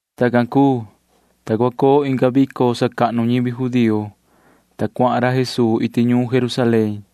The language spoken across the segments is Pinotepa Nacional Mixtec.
Tacan cuu, ta cua coo inga vico sacahnu ñivi judío, ta cuahan ra Jesuu iti ñuun Jerusalén.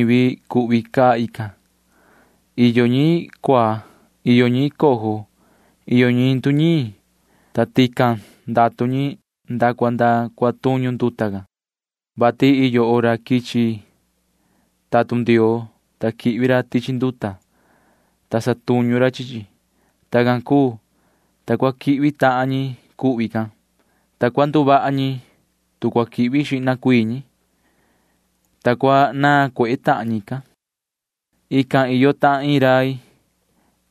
Tuvi xaan ñivi cuhvi caa tican. Iyo ñi cuaa. Iyo ñi cojo. Iyo ñi nduñiin. Iyo ñi, ta tican ndatu ñi nda cua nda cua tuñu nduta can, vati iyo hora quichi tatun Ndioo, ta quihvi ra tichi nduta, ta satuñu ra chi chi. Tacan cuu, ta cua quihvi tahan ñi cuhvi can, ta cua nduvaha ñi, tu cua quihvi xihna cuii ñi, ta cua naan cuehe tahan ñican. Tican iyo tahan iin rai,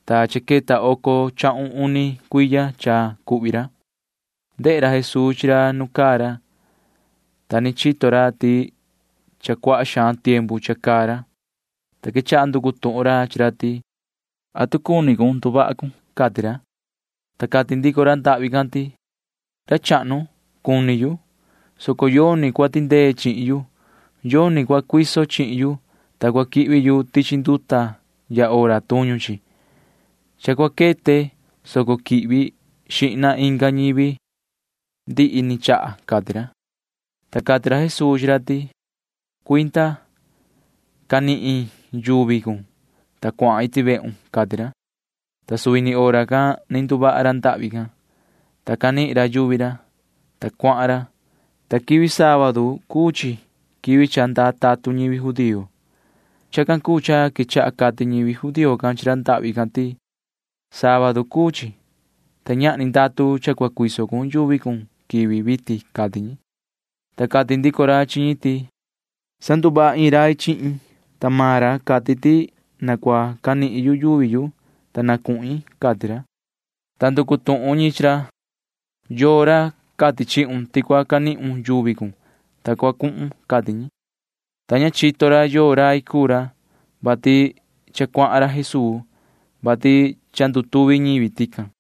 ta cha queta oco chahun uni cuiya cha cuhvi ra. Ndehe ra Jesuu chi racan nu caa ra, ta ni chito ra ti nahan xaan cha caa ra, ta quechaha nducu tuhun ra chi ra ti: ―¿Atu cuni cun nduvaha cun? ―cati ra. Ta cati ndico ra ndahvi can ti: ―Ra chahnu, cuni yu, soco yoni cua tindee chihin yu. Yoni cua cuiso chihin yu, ta cua quihvi yu tichi nduta ya hora tuñu chi. Cha cua quete, soco quihvi xihna inga ñivi ndihi ni chaha ―cati ra. Ta cati ra Jesuu chi ra ti: ―Cuinda. Canihun yuvi cun, ta cuahan iti vehun ―cati ra. Ta suvi ni hora can ni nduvaha ra ndahvi can, ta canihin ra yuvi ra, ta cuahan ra, ta quivi sábadu [quivi cha ndaa tatun ñivi judío] cuu chi. Chacan cuu cha quechaha cati ñivi judío can chi ra ndahvi can ti: ―Sábadu cuu chi, ta ñahni ndatu cha cua cuiso cun yuvi cun quivi vitin ―cati ñi. Ta cati ndico ra chi ñi ti: ―Sanduvaha iin rai chihin yu, ta maan ra cati ti na cua canihin yu yuvi yu, ta na cuhin ―cati ra. Ta nducu tuhun ñi chi ra: ―¿Yoo ra cati chihun ti cua canihun yuvi cun, ta cua cuhun? ―cati ñi. Ta ña chito ra yoo rai cuu ra, vati cha cuahan ra Jesuu, vati cha ndutuvi ñivi tican.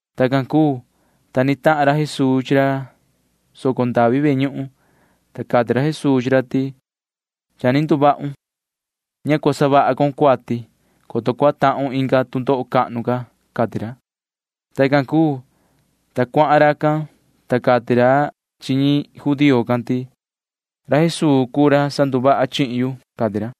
Tacan cuu, ta ni tahan ra Jesuu chi ra soco ndavi ve ñuhun, ta cati ra Jesuu chi ra ti: ―Cha ni nduvahun. Ña cua savaha con cuati, coto cua tahun inga tu ndoho cahnu ca ―cati ra. Tacan cuu, ta cuahan racan, ta cati ra chi ñi judío can ti: ―Ra Jesuu cuu ra sanduvaha chihin yu ―cati ra.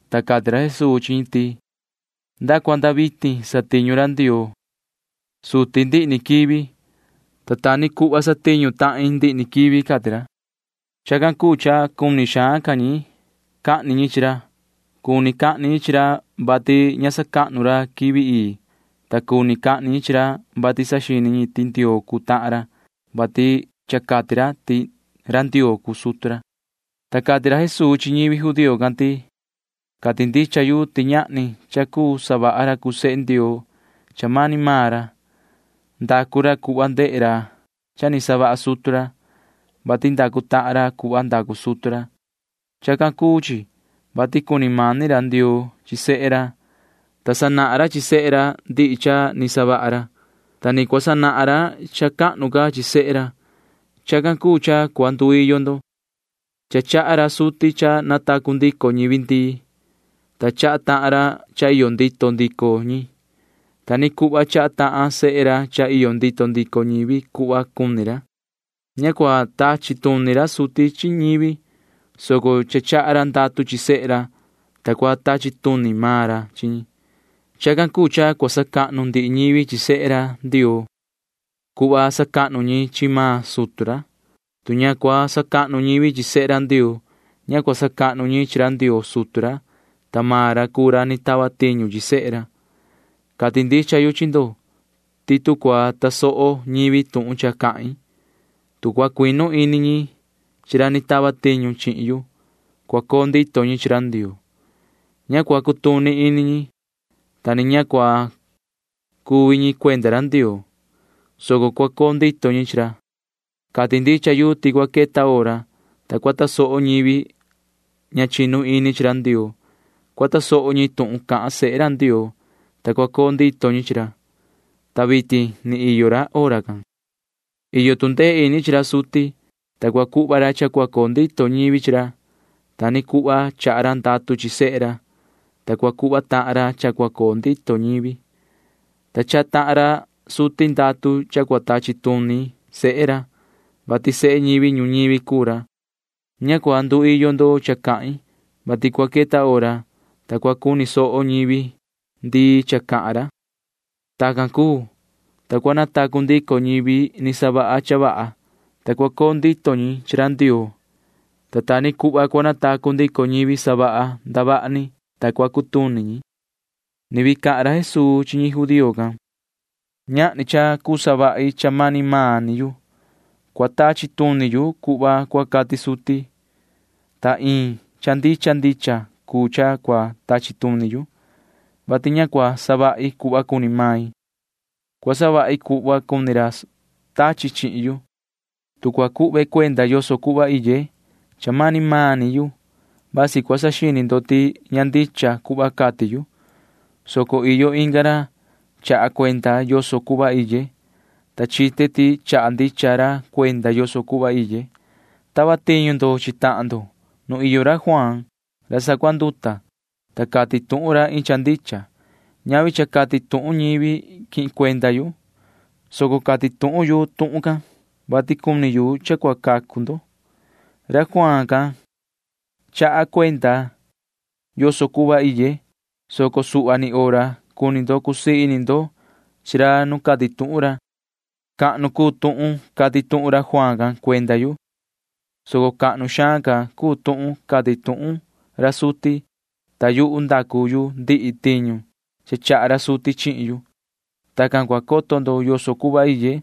ta cati ra Jesuu chi ñi ti: ―Nda cua nda vitin satiñu ra Ndioo suti ndihi ni quivi, ta ta ni cuhva satiñu tahin ndihi ni quivi ―cati ra. Chacan cuu cha cuni xaan ca ñi cahni ñi chi ra. Cuni cahni ñi chi ra, vati ña sacahnu ra quivi ii, ta cuni cahni ñi chi ra, vati saxini ra ti Ndioo cuu tahan ra, vati cha cati ra ti ra Ndioo cuu sutu ra. Ta cati ra Jesuu chi ñivi judío can ti: ―Cati ndicha yu ti ñahni cha cuu savaha ra cuu sehe Ndioo cha mani maan ra. Ndacu ra cuhva ndehe ra cha ni savaha sutu ra, vati ndacu tahan ra cuhva ndacu sutu ra. Chacan cuu chi, vati cuni mani ra Ndioo chi sehe ra, ta sanahan ra chi sehe ra ndihi cha ni savaha ra, ta ni cua sanahan ra cha cahnu ca chi sehe ra. Chacan cuu cha cua nduiyo ndo. Cha chaha ra suti cha natacu ndico ñivi ndii, ta chaha tahan ra cha iyo ndito ndico ñi. Ta ni cuhva chaha tahan sehe ra cha iyo ndito ndico ñivi cuhva ni cuni ra. Ña cua tachi tuni ra suti chi ñivi, soco cha chaha ra ndatu chi sehe ra, ta cua tachi tuni maan ra chi ñi. Chacan cuu cha cua sacahnu ndihi ñivi chi sehe ra Ndioo cuhva sacahnu ñi chi maan sutu ra. Tu ña cua sacahnu ñivi chi sehe Ndioo, ña cua sacahnu ñi chi ra Ndioo sutu ra, ta maan ra cuu ra ni tava tiñu chi sehe ra. ’Cati ndicha yu chi ndo ti tu cua tasoho ñivi tuhun cha cahin, tu cua cuinu ini ñi chi ra ni tava tiñu chihin yu, cua coo ndito ñi chi ra Ndioo. Ña cua cutuni ñi, ta ni ña cua cuvi ñi cuenda ra Ndioo, soco cua coo ndito ñi chi ra. Cati ndicha yu ti cua queta hora, ta cua tasoho ñivi ña chinu ini chi ra Ndioo. Cua tasoho ñi tuhun cahan sehe ra Ndioo, ta cua coo ndito ñi chi ra, ta vitin ni iyo hora can. Iyo tu ndee ini chi ra suti, ta cua cuhva ra cha cua coo ndito ñivi chi ra. Ta ni cuhva chaha ra ndatu chi sehe ra, ta cua cuhva tahan ra cha cua coo ndito ñivi, ta chaha tahan ra suti ndatu cha cua tachi tuni sehe ra, vati sehe ñivi ñuñivi cuu ra. Ña cua nduiyo ndo cha cahin, vati cua queta hora, ta cua cuni soho ñivi ndii cha cahan ra. Tacan cuu, ta cua natacu ndico ñivi ni savaha cha vaha, ta cua coo ndito ñi chi ra Ndioo, ta ta ni cuhva cua natacu ndico ñivi savaha ndavaha ni, ta cua cutuni ñi. [Ni vii cahan ra Jesuu chi ñi judío can:] ’Ñahni cha cuu savahi cha mani yu. Cua tachi tuni yu cuhva cua cati suti, ta iin cha ndicha ndicha cuu cha cua tachi tuni yu, vati ña cua savahi cuhva cuni yu, soco cua savahi cuhva cuni ra tachi chihin yu. Tu cua cuhve cuenda yoso cuhva iye cha mani maan ni yu, vasi cua saxini ndo ti ña ndicha cuhva cati yu, soco iyo inga ra cha chaha cuenda yoso cuhva iye, ta chite ti chaha ndicha ra cuenda yoso cuhva iye. Tava tiñu ndo chi tahan ndo nu iyo ra Juaan ra sacuanduta, ta cati tuhun ra iin cha ndicha. Ñavi cha cati tuhun ñivi quihin cuenda yu, soco cati tuhun yu tuhun can, vati cuni yu cha cua cacu ndo. Ra Juaan can chaha cuenda yoso cuhva iye, soco suhva ni hora cuni ndo cusii ini ndo chi ra nu cati tuhun ra. Cahnu cuu tuhun cati tuhun ra Juaan can cuenda yu, soco cahnu xaan ca cuu tuhun cati tuhun ra suti, ta yuhu ndacu yu ndihi tiñu cha chaha ra suti chihin yu. Tacan cua coto ndo yoso cuhva iye,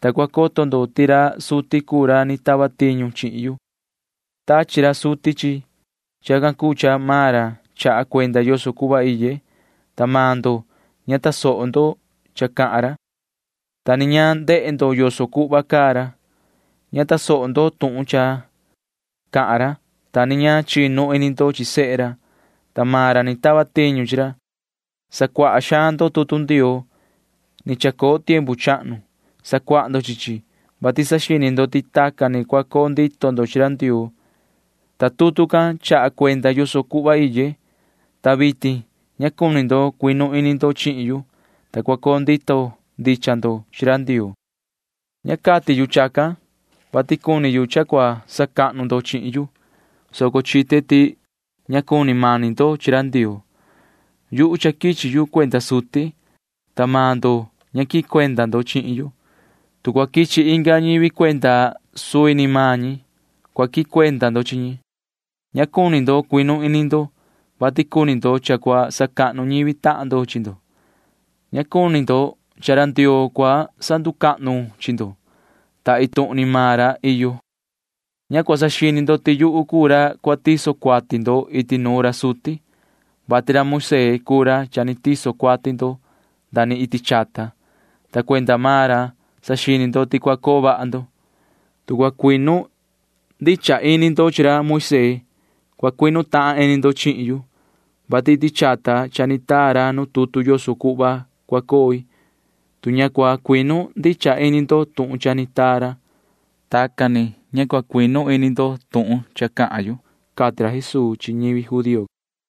ta cua coto ndo ti ra suti cuu ra ni tava tiñu chihin yu. Tachi ra suti chihin yu. Chacan cuu cha maan ra chaha cuenda yoso cuhva iye, ta maan ndo ña ta tasoho ndo cha cahan ra, ta ni ña ni ndehe ndo yoso cuhva caa ra. Ña tasoho ndo tuhun cha cahan ra, ta ni ña chinu ini ndo chi sehe ra, ta maan ra ni tava tiñu chi ra. Sacuaha xaan ndo tutu Ndioo ni chacoo tiempu chahnu. Sacuaha ndo chi chi, vati saxini ndo ti tacan ni cua coo ndito ndo chi ra Ndioo, ta tutu can chaha cuenda yoso cuhva iye, ta vitin ña cuni ndo cuinu ini ndo chihin yu, ta tacan sa cua coo ndito ndicha ndo chi ra Ndioo. ’Ña cati yu chacan, vati cuni yu cha cua sacahnu ndo chihin yu, soco chite ti ña cuni mani ndo chi ra Ndioo. Yuhu cha quichi yu cuenda suti, ta maan ndo ña quihin cuenda ndo chihin yu. Tu cua quichi inga ñivi cuenda suvi ni maan ñi, cua quihin cuenda ndo chi ñi. Ña cua cuu cuinu ini ndo, vati cuni ndo cha cua sacahnu tahan ndo chi ndo. Ña cuni ndo cha cua sacahnu ra Ndioo chi ndo, ta iin tuhun ni maan ra iyo. Ña cua saxini ndo ti yuhu cuu ra cua tiso cuati ndo iti nuun ra suti, vati Moisee cuu ra cha ni tiso cuati ndo nda ni iti chata, ta cuenda maan ra saxini ndo ti cua coo vaha ndo. Tu cua cuinu ndicha ini ndo chi ra Moisee, cua cuinu tahan ini ndo chihin yu, vati iti chata cha ni taa ra nu tutu yoso cuhva cua coi. Tu ña cua cuinu ndicha ini ndo tuhun cha ni taa ra, tacan tucu ña cua cuinu ini ndo tuhun cha cahan yu ―cati ra Jesuu chi ñivi judío can.